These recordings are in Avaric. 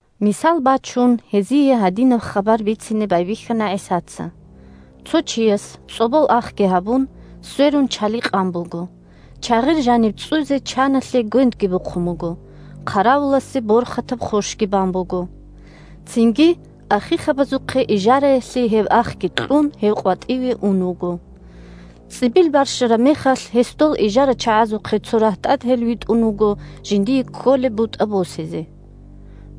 Мисал бачун, гьезие гьадинаб хабар бицине байбихьана ГӀисаца: – Цо чияс, цӀолбол ахги гьабун, сверун чали къан буго, чагъир жаниб цӀцӀуйзе чаналъе гвендги бухъун буго, хъаравуласе борхатаб хъощги бан буго. Цинги ахихъабазухъе ижараялъе гьеб ахги кьун, гьев къватӀиве ун вуго. ЦӀибил барщараб мехалъ, гьес дол ижарачагӀазухъе цо рагьтӀател витӀун вуго жиндие кколеб бутӀа босизе.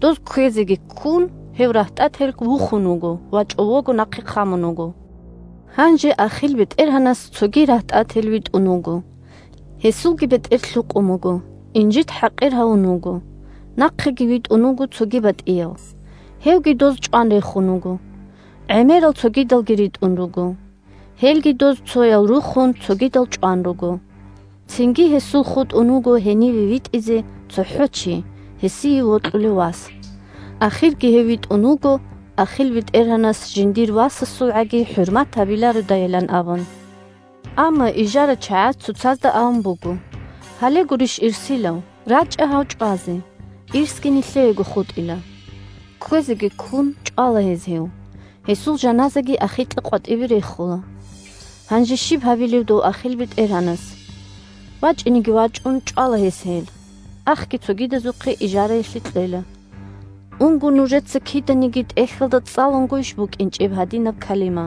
Доз кквезеги ккун гьев рагьтӀател вухун вуго ва чӀового нахъе хъамун вуго. Гьанже ахил бетӀергьанас цоги рагьтӀател витӀун вуго. Гьесулги бетӀер лъукъун буго, инжит-хӀакъир гьавун вуго. Нахъеги витӀун вуго цоги батӀияв. Гьевги доз чӀван рехун вуго. ГӀемерал цогидалги ритӀун руго. Гьелги доз цоял рухун, цогидал чӀван руго. Цинги гьесул хутӀун вуго гьениве витӀизе цохӀо чи – гьесие вокьулев вас. Ахирги гьев витӀун вуго ахил бетӀергьанас, жиндир васасулгӀаги хӀурмат гьабилародайилан абун. Амма ижарачагӀаз цоцазда абун буго: «Гьале гурищ ирсилав. РачӀа гьав чӀвазе, – ирсги нилъеего хутӀила». Кквезеги ккун, чӀвала гьез гьев, гьесул жаназаги ахикьа къватӀибе рехула. Гьанже щиб гьабилеб дов ахил бетӀергьанас? ВачӀинеги вачӀун, чӀвала гьес гьел, ахги цогидазухъе ижараялъе кьела. Унго нужеца киданиги ТӀехьалда цӀалунгойищ букӀинчӀеб гьадинаб калима: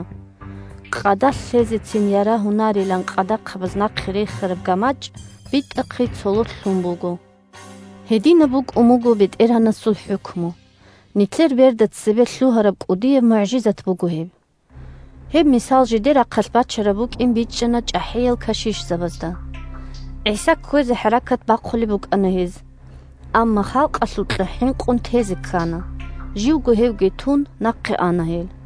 «Къадалъ лъезецин ярагьунарилан къадахъабаз нахъе рехараб гамачӀ битӀахъе цололъ лъун буго. Гьединаб букӀун буго БетӀергьанасул хӀукму. Нилъер берда цебе лъугьараб кӀудияб мугӀжизат буго гьеб!» Гьеб мисал жидер рахъалъ бачараб букӀин бичӀчӀана чӀахӀиял кашишзабазда. ГӀиса кквезе хӀаракат бахъулеб букӀана гьез. Амма халкъалъукьа хӀинкъун тезе ккана. Живго гьевги тун, нахъе ана гьел.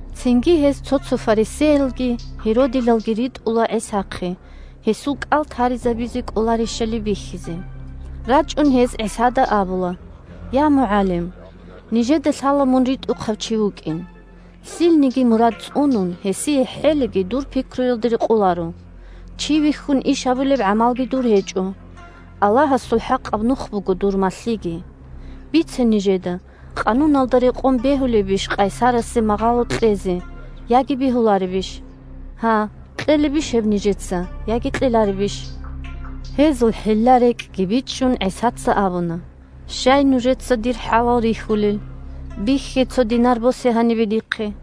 Цинги гьез цо-цо фарисеялги гьеродилалги ритӀула ГӀисахъе, гьесул кӀал таризабизе кӀоларищали бихьизе. РачӀун гьез ГӀисада абула: – Я МугӀалим! Нижеда лъала мун ритӀухъав чи вукӀин. Лъилниги мурад цӀунун, гьесие хӀелиги дур пикруялда рекъоларо. Чи вихьун иш гьабулеб гӀамалги дур гьечӀо. Аллагьасул хӀакъаб нух буго дур малъиги. Бице нижеда: къануналда рекъон, бегьулебищ къайсарасе магъало кьезе яги бегьуларебищ? Гьа, кьелебищ гьеб нижеца яги кьеларебищ? Гьезул хӀилла-рекӀкӀги бичӀчӀун, ГӀисаца абуна: – Щай нужеца дир хӀалал рихьулел? Бихье, цо динар босе гьанибе дихъе.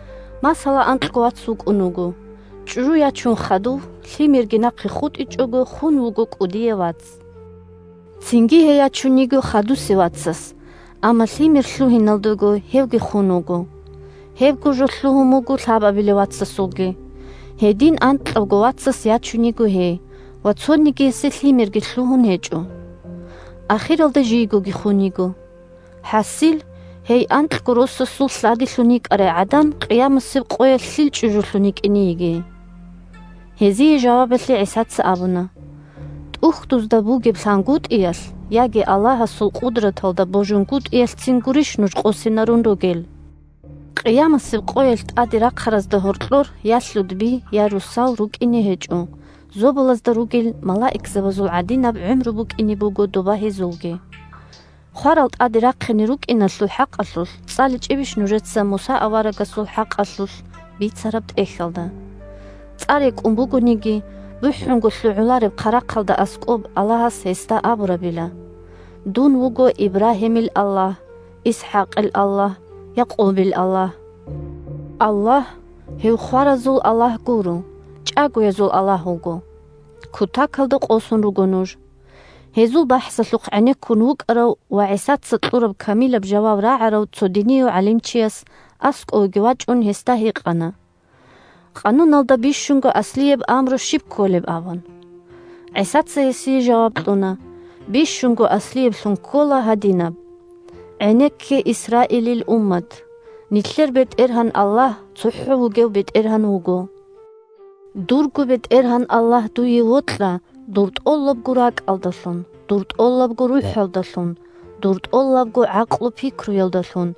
Масала, анкьго вац вукӀун вуго. ЧӀужу ячун хадув, лъимерги нахъе хутӀичӀого, хун вуго кӀудияв вац. Цинги гьей ячун йиго хадусев вацас, амма лъимер лъугьиналдего, гьевги хун вуго. Гьебго жо лъугьун буго лъабабилев вацасулги. Гьедин анкьавго вацас ячун йиго гьей, ва цонигиясе лъимерги лъугьун гьечӀо. Ахиралда жийгоги хун йиго. ХӀасил, гьей анкьго росасул лъадилъун йикӀарай гӀадан къиямасеб къоялъ лъил чӀужулъун йикӀине йигей? Гьезие жавабалъе ГӀисаца абуна: – ТӀухьдузда бугеб лъангутӀиялъ, яги Аллагьасул къудраталда божунгутӀиялъцин гурищ нуж къосинарун ругел? Къиямасеб къоялъ тӀаде рахъаразда гьоркьор я лъудби, я росал рукӀине гьечӀо, зобалазда ругел малаикзабазул гӀадинаб гӀумру букӀине буго доба гьезулги. Хварал тӀаде рахъине рукӀиналъул хӀакъалъулъ цӀаличӀебищ нужеца Муса аварагасул хӀакъалъулъ бицараб тӀехьалда? ЦӀа рекӀун бугониги, бухӀунго лъугӀулареб хъарахъалда аскӀоб Аллагьас гьесда абурабила: «Дун вуго Ибрагьимил Аллагь, ИсхӀакъил Аллагь, Якъубил Аллагь». Аллагь – гьев хваразул Аллагь гуро, чӀагоязул Аллагь вуго. Кутакалда къосун руго нуж! Гьезул бахӀсалъухъ гӀенеккун вукӀарав ва ГӀисаца кьураб камилаб жаваб рагӀарав цо динияв гӀалимчияс, аскӀове вачӀун, гьесда гьикъана: – Къануналда бищунго аслияб амру щиб кколеб? – абун. ГӀисаца гьесие жаваб кьуна: – Бищунго аслияблъун ккола гьадинаб: «ГӀенекке, Исраилил уммат! Нилъер БетӀергьан Аллагь цохӀо вугев БетӀергьан вуго! Дурго БетӀергьан Аллагь дуе вокьа дур тӀолабго ракӀалдалъун, дур тӀолабго рухӀалдалъун, дур тӀолабго гӀакълу-пикруялдалъун,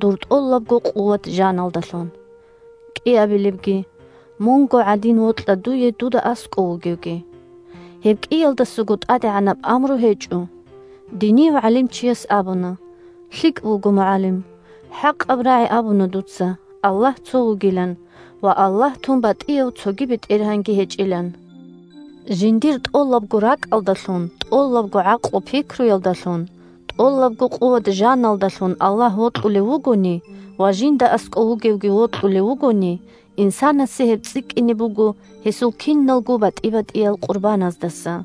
дур тӀолабго къуват-жаналдалъун». КӀиабилебги: «Мунго гӀадин вокьа дуе дуда аскӀов вугевги». Гьеб кӀиялдасаго тӀадегӀанаб амру гьечӀо. Динияв гӀалимчияс абуна: – ЛъикӀ буго, МугӀалим! ХӀакъаб рагӀи абуна дуца, Аллагь цо вугилан ва Аллагь тун батӀияв цоги бетӀергьанги гьечӀилан. Жиндир тӀолабго ракӀалдалъун, тӀолабго гӀакълу-пикруялдалъун, тӀолабго къуват-жаналдалъун Аллагь вокьулев вугони ва жинда аскӀов вугевги вокьулев вугони, инсанасе гьеб цӀикӀкӀине буго гьесул киналго батӀи-батӀиял къурбаназдаса.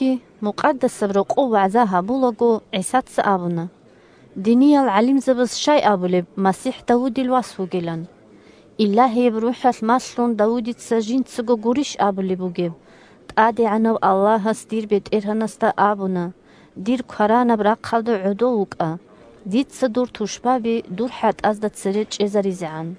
Хадубги Мукъадасаб Рокъоб вагӀза гьабулаго, ГӀисаца абуна: – Диниял гӀалимзабаз щай абулеб МасихӀ Давудил вас вугилан. Илагьияб РухӀалъ малъун Давудица жинцаго гурищ абулеб бугеб: «ТӀадегӀанав Аллагьас дир БетӀергьанасда абуна: „Дир кваранаб рахъалда гӀодов вукӀа, дица дур тушбаби дур хӀатӀазда цере чӀезаризегӀан“».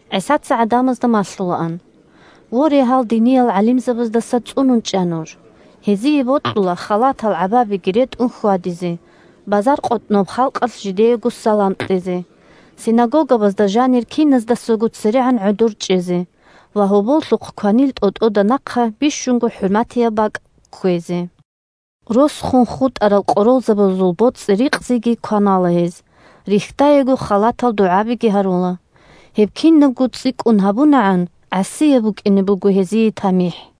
ГӀисаца гӀадамазда малъулаан: – Воре, гьал диниял гӀалимзабаздаса цӀунун чӀа нуж. Гьезие бокьула халатал гӀабабиги ретӀун хьвадизе, базаркъотӀноб халкъалъ жидеего салам кьезе, синагогабазда жанир киназдасаго церегӀан гӀодор чӀезе ва гьоболлъухъ кванил тӀотӀода нахъа бищунго хӀурматияб бакӀ кквезе. Рос хун хутӀарал къоролзабазул боцӀи-рикъзиги кванала гьез, рихьдаего халатал дугӀаби гьарула. Гьеб кинабго цӀикӀкӀун гьабунагӀан, гӀасияб букӀине буго гьезие тамихӀ.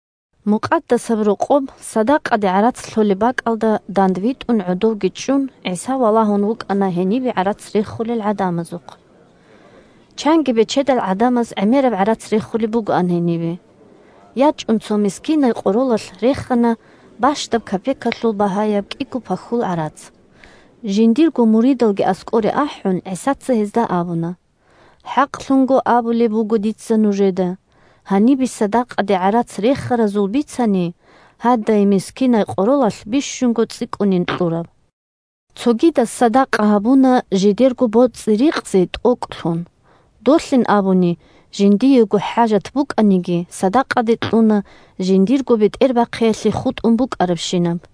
Мукъадасаб Рокъоб садакъаде гӀарац лъолеб бакӀалда дандвитӀун гӀодовги чӀун, ГӀиса валагьун вукӀана гьенибе гӀарац рехулел гӀадамазухъ. Чанги бечедал гӀадамаз гӀемераб гӀарац рехулеб бугоан гьенибе. ЯчӀун цо мискинай къоролалъ рехана бащдаб капекалъул багьаяб кӀиго пахьул гӀарац. Жиндирго муридалги аскӀоре ахӀун, ГӀисаца гьезда абуна: – ХӀакълъун абулеб буго дица нужеда: гьанибе садакъаде гӀарац рехаразул бицани, гьадай мискинай къоролалъ бищунго цӀикӀкӀунин кьураб. Цогидаз садакъа гьабуна жидерго боцӀи-рикъзи тӀокӀлъун, долъин абуни жиндиего хӀажат букӀаниги, садакъаде кьуна жиндирго бетӀербахъиялъе хутӀун букӀарабщинаб.